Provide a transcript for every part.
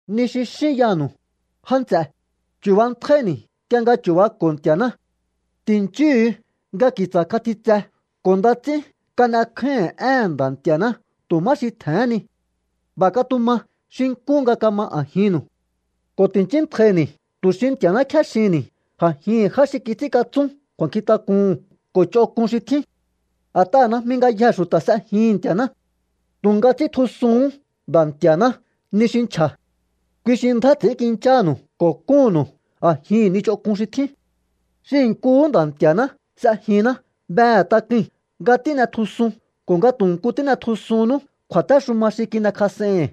Ni xi xín yanu̱u, já nts'e, chu̱bantjáíni̱ nk'ie nga chu̱bako̱o Nti̱a̱ná. Ti̱nchúhu̱u nga ki̱tsa̱ katjitse ko̱ nda ts'ín kan'ekjáíhi̱n éhe̱n Nda̱ Nti̱a̱ná tu̱ má xi tje̱hén ni. B'a̱ katuma xi nkú nga kama a̱jinnu̱u. Ko̱ ti̱nchíntjaini̱ tu̱ xi Nti̱a̱ná kjéxihi̱nni̱ a̱jihi̱n já xi kits'ínkatsún kju̱a̱nkjintak'uhu̱n ko̱ ch'onk'un xi tjín. A̱t'aha̱ najmi ngayjee̱ xu̱ta̱ s'ejihi̱n Nti̱a̱ná. Tu̱nga ts'íntjusuhún Nda̱ Nti̱a̱ná ni xi nchja̱. Kui xi ndjá ts'i̱ínkinchánu̱u ko̱ kúnnu̱u a̱jihi̱n ni ch'onk'un xi tjín. Xihi̱ nkuhú Nda̱ Nti̱a̱ná s'ejinná behe̱ tak'ui̱n nga tín'etjusun ko̱ nga tu̱ nku n'e̱tjusunnú kju̱a̱téxuma xi kin'ekjas'ei̱hi̱n.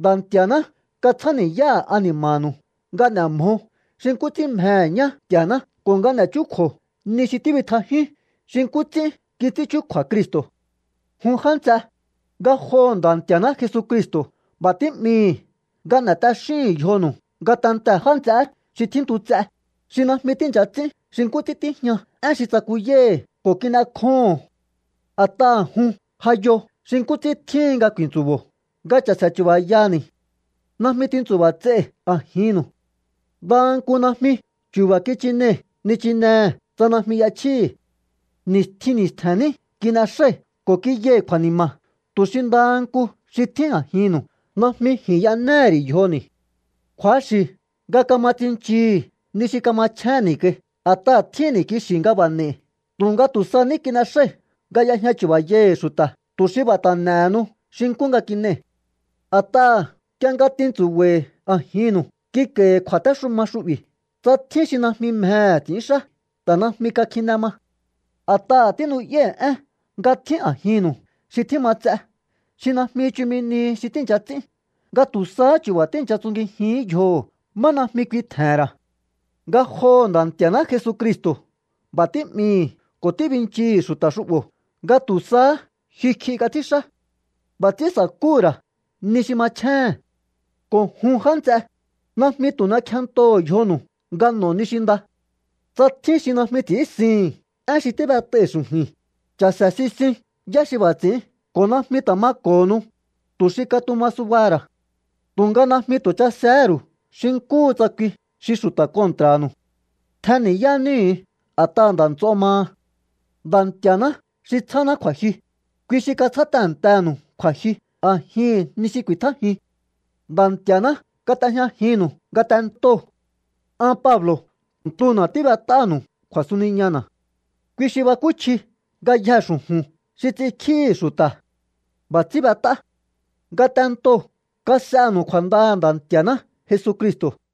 Nda̱ Nti̱a̱ná katsjáni̱yáha̱ ani̱ma̱nu̱u nga n'e̱ mjo xi nkú ts'ín mjehe̱ ñá Nti̱a̱ná ko̱ nga n'e̱ chúkju̱o ni xi tíbitjajíún xi nkú ts'ín kits'ín chúkju̱a̱ Cristo̱. Jun já nts'e, ngajoho̱ Nda̱ Nti̱a̱ná Jesucristo̱ b'a̱ tí'mii̱hi̱ nga n'e̱ t'axíhu̱un yjonu̱u ngatentee̱ já nts'eé xi tjíntu ts'e, xi najmi tíi̱ncha ts'ín xi nkú ts'ín tíjña én xi tsakuyái̱hi̱ ko̱ kin'ekjóho̱on. A̱t'aha̱ jun ja yo xi nkú ts'ín tjíhin nga ku̱i̱ntsu̱bo̱o nga cha̱se̱ chu̱ba̱yani̱. Najmi tintsu̱ba̱ ts'ei̱ a̱jinnu̱u. Ndaha nku najmi chu̱ba̱ kichinei̱ nichinehe̱ tsa najmi y'echjíi̱hi̱. Ni̱stjin ni̱stje̱n ní kin'exái̱ ko̱ kiyai̱ kju̱a̱ni̱ma̱ tu̱ xi ndaha nku xi tjín a̱jinnu̱u najmi ji̱n y'enéhe̱ ri̱ yjoni̱. Kju̱axi̱ nga kama tsinchii̱hi̱ ni xi kamachjénni̱ kai, a̱t'aha̱ tjínni̱ kixi̱ nga b'a̱ n'e̱i̱. Tu̱nga tu̱ sa ní kin'exái̱ nga y'ejña chu̱ba̱yai̱hi̱ xu̱ta̱, tu̱ xi b'a̱ ta̱ n'e̱henu xi nkú nga kin'ei̱. A̱t'aha̱ nk'ie nga tintsu̱ba̱i̱ a̱jinnu̱u, kik'a̱i̱hi̱ kju̱a̱téxuma xu'bi̱: “Tsa tjín xi najmi mjehe̱ ts'i̱ínxá, ta̱ najmi kakjine ma.” A̱t'aha̱ tínu'yái̱ én nga tjín a̱jinnu̱u xi tjíma ts'e, xi najmi chumi nihi xi tíi̱ncha ts'ín, nga tu̱ sahá chu̱ba̱ tíi̱ncha tsungijihín yjoho̱ má najmi kui tje̱he̱n ra̱. Ngajoho̱ Nda̱ Nti̱a̱ná Jesucristo̱ b'a̱ tí'mii̱hi̱ ko̱ tíbinchii̱hi̱ xu̱ta̱ xu'bo̱ nga tu̱ sahá jyukj'i kats'ínxá. B'a̱ ts'ín sa̱kúhu̱ ra̱ ni xi machjéhe̱n. Ko̱ jun já nts'e, najmi tu̱ n'ekjentoho̱o yjonu̱u nga n'o̱o ni xi nda. Tsa tjín xi najmi ts'i̱ínsihi̱n én xi tíb'et'ai̱ xu̱ju̱i̱n, cha̱se̱ sisiun yá xi b'a̱ ts'i̱ín ko̱ najmi ta̱ mako̱honu, tu̱ xi katuma subaha̱ ra̱. Tu̱nga najmi tu̱ chasehé ru̱u xi nkúhu tsa kui xi xu̱ta̱ kontra̱nu̱u. Tjenni̱yá níhu̱u a̱t'aha̱ nda̱ nts'o maha. Nda̱ Nti̱a̱ná xi tsjáná kju̱a̱jyu, kui xi katsjá tehe̱ntenu̱u kju̱a̱jyu a̱jihi̱n ni xi ku̱i̱tjájiun. Nda̱ Nti̱a̱ná kat'ejñajinnu̱u ngatentoo̱. An Pablo̱ ntuna̱ tíb'et'áha̱nu̱u kju̱a̱suniñana̱. Kui xi bakúchji ngayjee̱ xu̱ju̱n xi ts'inkjíhi̱ xu̱ta̱. B'a̱ ts'ín b'et'á. Ngatentoo̱ kas'enu̱u kju̱a̱ndaha̱ Nda̱ Nti̱a̱ná Jesucristo̱.